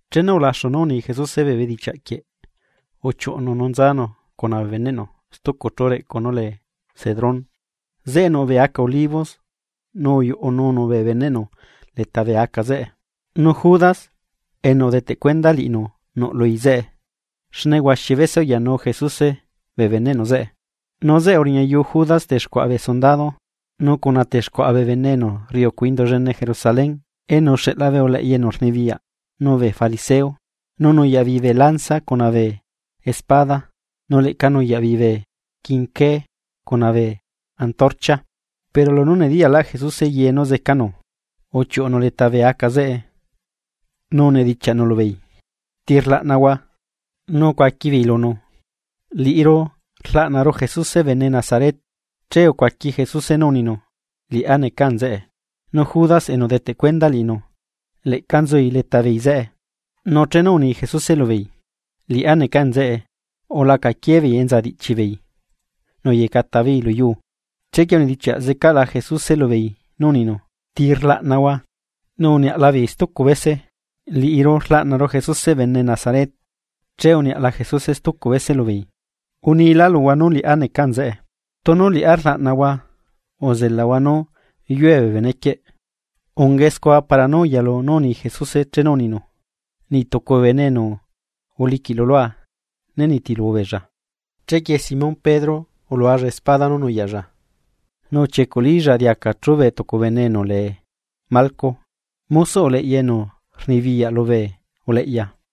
Chenu ulaxu nú uni Jesuse bee bedichiaꞌ quieꞌ, uchiuꞌunu nú nzanu cuna bee beneꞌnu stucu chú reꞌcu nú lee Cedrón. Zeꞌe nuꞌ bee aca olivos nu uyuꞌununu bee beneꞌnu leta bee aca zeꞌe. Nu Judas, enu udeteꞌ cuenda liꞌinu nuꞌlui zeꞌe, xne huaxi bese uyanu Jesuse liꞌibeella zeꞌe. Nu zeꞌe uriñayu Judas texcuaꞌa bee sundado, nu cuna texcuaꞌa bee bene enu rriucu Indu llene Jerusalén enu uxeꞌla bee uleꞌya enu rnibiyaꞌ nu bee fariseo nu nuyaꞌ beei bee lanza cuna bee espada nu leꞌca nuyaꞌ beei bee quinqué cuna bee antorcha. Pero lunú nediyaꞌlaꞌ Jesuse ye nú zecanu, uchiuꞌunu leta bee aca zeꞌe, nu unidichiaꞌnu lubeei: ―¿Ti rlaꞌnahua? Nu ucuaquibeei lunu: ―Liꞌiru rlaꞌnaru Jesuse bene Nazaret. Che ucuaqui Jesuse nú uninu: ―Liꞌá neca nzeꞌe. Nu Judas enu udeteꞌ cuenda liꞌinu leꞌca nzui leta beei zeꞌe. Nu chenu uni Jesuse lubeei: “Liꞌá neca nzeꞌe”, ulacaquie beei enza diꞌchibeei nu uyecata beei lu yuu. Chequie unidichiaꞌ zecaꞌla Jesuse lubeei nú uninu: ―¿Ti rlaꞌnahua? Nu uniaꞌla beei stucu bese: ―Liꞌiru rlaꞌnaru Jesuse bene Nazaret. Che uniaꞌla Jesuse stucu bese lubeei: ―Unila luhua nú liꞌá neca nzeꞌe. Tunu liꞌá rlaꞌnahua, uzelahua nú yue bee benequieꞌ. Ungae scua para nú uyalu nú uni Jesuse chenu uninu: “Niꞌ tucu bee bene enu uliquiꞌlu lua né nitilu beella.” Chequie Simón Pedro ulualla espada nú nuyaꞌlla nu uchiecuꞌlilla diaca chubé tucu bene enu lee Malco mosoꞌ uleꞌya enu rnibiyaꞌ lubee uleꞌya.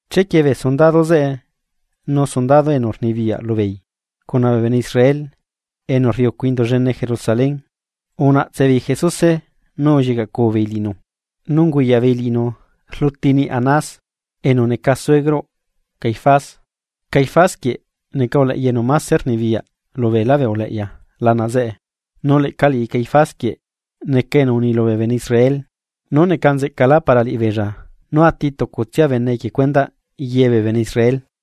Chequie bee sundado zeꞌe nu tucu sundado enu rnibiyaꞌ lubeei, cuna bee bene Israel enu rriucu Indu llene Jerusalén, unaꞌtsebeei Jesuse nu ullicaꞌcubeei liꞌinu. Nu unguyaꞌ beei liꞌinu rluti niꞌ Anás, enu neca suegroꞌ Caifás, Caifás quieꞌ neca uleꞌya enu máse rnibiyaꞌ lubeelá uleꞌya lana zeꞌe. Nu leꞌca liꞌi Caifás quieꞌ neca enu uni lubee bene Israel nú neca nzeꞌcalá para liꞌibeella nú ati tucutsia bene equie cuendaꞌ ye bee bene Israel.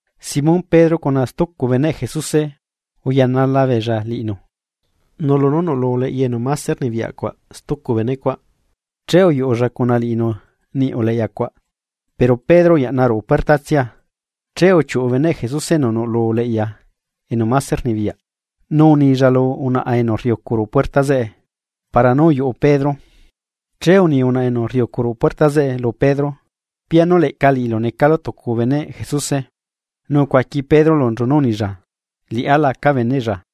Simón Pedro cuna stucu beneꞌ Jesuse uyanala beella liꞌinu. Nu lunú nuꞌlu uleꞌya enu mase rnibiyaꞌ cuaꞌ stucu benecuaꞌ, che uyuꞌulla cuna liꞌinu niꞌ uleꞌyacuaꞌ, pero Pedro uyaꞌna ruꞌu puertatsia. Che uchiuꞌu beneꞌ Jesuse enu nuꞌlu uleꞌya enu máse rnibiyaꞌ, nu unilla lu unaꞌa enu rriucu ruꞌu puerta zeꞌe para nú uyuꞌu Pedro. Che uni unaꞌa enu rriucu ruꞌu puerta zeꞌe lu Pedro: ―¿Pianu leꞌca liꞌilu necalu tucu beneꞌ Jesuse? Nu ucuaqui Pedro lunchu nú unilla: ―Liꞌá laca beneꞌlla.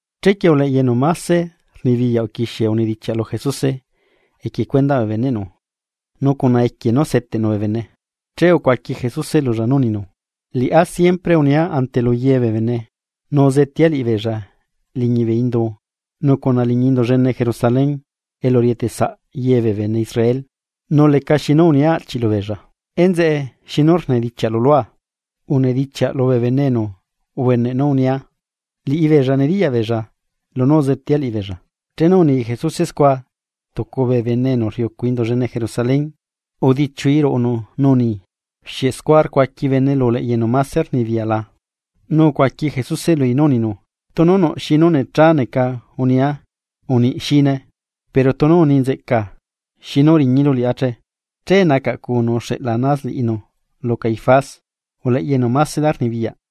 Chequie uleꞌya enu mase rnibiyaꞌ uquixie unedichiaꞌ lu Jesuse equie cuendaꞌ bee beneꞌnu nu cuna equie nú seteꞌnu bee bene. Che ucuaqui Jesuse lulla nú uninu: ―Liꞌá siempre unia ante luye bee bene nu uzetea liꞌibeella liñi bee indu nu cuna liñi Indu llene Jerusalén elu rieteꞌsaꞌ ye bee bene Israel, nu lecaxi nú unia aꞌchiꞌ lubeella. ¿Enzeꞌe xinu rnedichiaꞌlu lua? Unedichiaꞌ lubee bene enu ubeneꞌ nú unia, liꞌibeella nediyaꞌ beella lunú uzetea liꞌibeella. Chenu uni Jesuse scua tucu bee bene enu rriucu ruꞌu Indu llene Jerusalén, udichiui ruꞌunu nu uni: ―¿Xieꞌ scua rcuaqui bene lu uleꞌya enu máse rnibiyaꞌ la? Nu ucuaqui Jesuse lui nú uninu: ―Tunu nuꞌ xi nú necha neca unia, uniꞌ xine. Pero tunu uni nzeꞌcaa, ¿xinu udiñilu liꞌá che? Che nacaꞌcunu uxeꞌla Anás liꞌinu lu Caifás uleꞌya enu másela rnibiyaꞌ.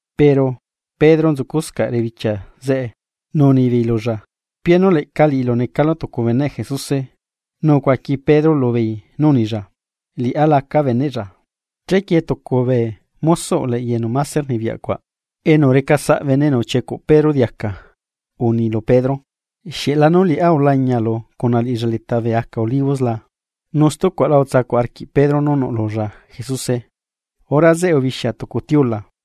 Pero Pedro nzuscaꞌ rebichia ruꞌu quii zeꞌe. Nu unibeei lulla: ―¿Pianu leꞌca liꞌilu necalu tucu beneꞌ Jesuse? Nu ucuaqui Pedro lubeei nú unilla: ―Liꞌá laca beneꞌlla. Chequie tucu bee mosoꞌ uleꞌya enu máse rnibiyaꞌ cuaꞌ, enu recasaꞌ bene enu uchiecuꞌ Pedro diaca, uni lu Pedro: ―¿Xieꞌlanu liꞌá ulañialu cuna liꞌilla leta bee aca olivos la? Nu stucuaꞌla utsacuꞌ arquiꞌ Pedro nú nuꞌlulla Jesuse. Hora zeꞌe ubixia tucu tiula.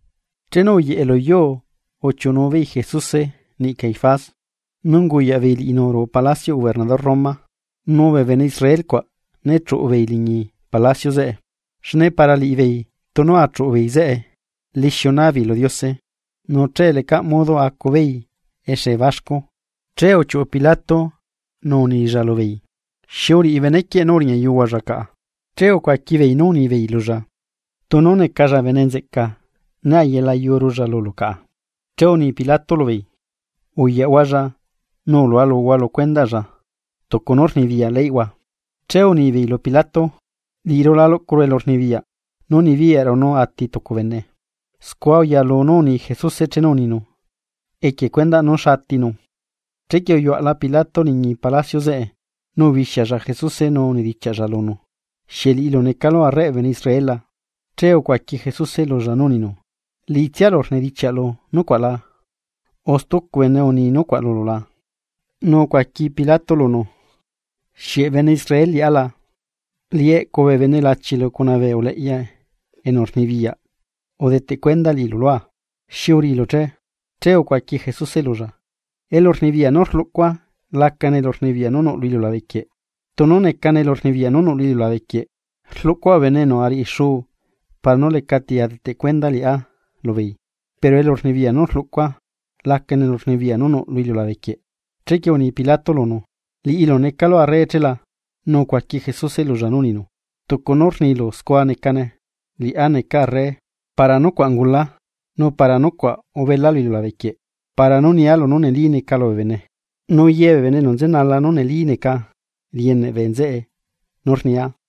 Chenu uyeꞌe lu yuu uchiuꞌunu beei Jesuse niꞌi Caifás nu unguyaꞌ beei liꞌinu ruꞌu palacioꞌ gobernador Roma. Nu bee bene Israel cuaꞌ né chuꞌu beei liñi palacio zeꞌe, xne para liꞌibeei tunu achuꞌu beei zeꞌe lixiu naa beei lu Diose, nu che lecaꞌ modo acubeei exe baxcu. Che uchiuꞌu Pilato nu unilla lubeei: ―¿Xi uriꞌi benequieꞌ nú uriñayuhualla caꞌa? Che ucuaqui beei nú unibeei lulla: ―Tunu necalla bene nzeꞌca né ayelayurulla lulu caꞌa. Che uni Pilato lu beei: ―Uyaꞌhualla, nu ulualuhua lu cuendaꞌlla tucu nú rnibiyaꞌ leyꞌhua. Che unibeei lu Pilato: ―Liꞌiru la luꞌcuru elurnibiyaꞌ nú nibiyaꞌru nú ati tucu bene. Scua uyalu nú uni Jesuse chenu uninu equie cuendaꞌ nú xa atinu. Chequie uyuaꞌla Pilato liñi palacio zeꞌe nu ubixialla Jesuse nu unedichiaꞌlla lunu: ―¿Xieꞌ liꞌilu necalu arreꞌ bee bene Israel la? Che ucuaqui Jesuse lulla nú uninu: ―¿Liꞌitsialu rnidichiaꞌlu nucuaꞌ la o stucu bene uni nucuaꞌ lulu la? Nu ucuaqui Pilato lunu: ―¿Xieꞌ bene Israel liꞌá la? Liꞌi eꞌcu bee bene lachilu cuna bee uleꞌya enu rnibiyaꞌ udeteꞌ cuenda liꞌilu lua. ¿Xi uriꞌilu che? Che ucuaqui Jesuse lulla: ―Elurnibiyaꞌ nú rluꞌcua lacane elurnibiyaꞌ nú nuꞌ lu iliulabequieꞌ. Tunu necane elurnibiyaꞌ nú nuꞌ lu iliulabequieꞌ, rluꞌcua bee bene enu ariꞌi xuu para nú lecati adeteꞌ cueda liꞌá lubeei pero elurnibiyaꞌ nú rluꞌcua lacane elurnibiyaꞌ nú nuꞌ lu iliulabequieꞌ. Chequie uni Pilato lunu: ―¿Liꞌilu necalu arre chela? Nu ucuaqui Jesuse lulla nú uninu: ―Tucu nu rnilu scua necane, liꞌá neca arre. Para nucuaꞌ ungula, nu para nucuaꞌ ubela lu iliulabe quieꞌ para nú nia lunú neli neca lubee bene. Ye bee bene enu nzenala nú neli neca rieneꞌ bee nzeꞌe nú rnia.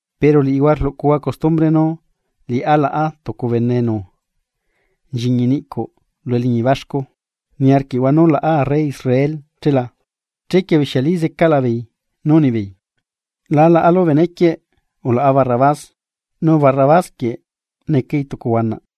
Pero liꞌihua rluꞌcuhua custumbre nú liꞌá laꞌa tucu bene enu nchiñi niꞌcuꞌ lu eliñi baxcu. ¿Niarquiꞌhua nú laꞌa Arre Israel che la? Chequie ubixialí zecaꞌlabeei nú unibeei: ―La laꞌalu benequieꞌ, ulaꞌa Barrabás. Nu Barrabás necai tucu huanaꞌ.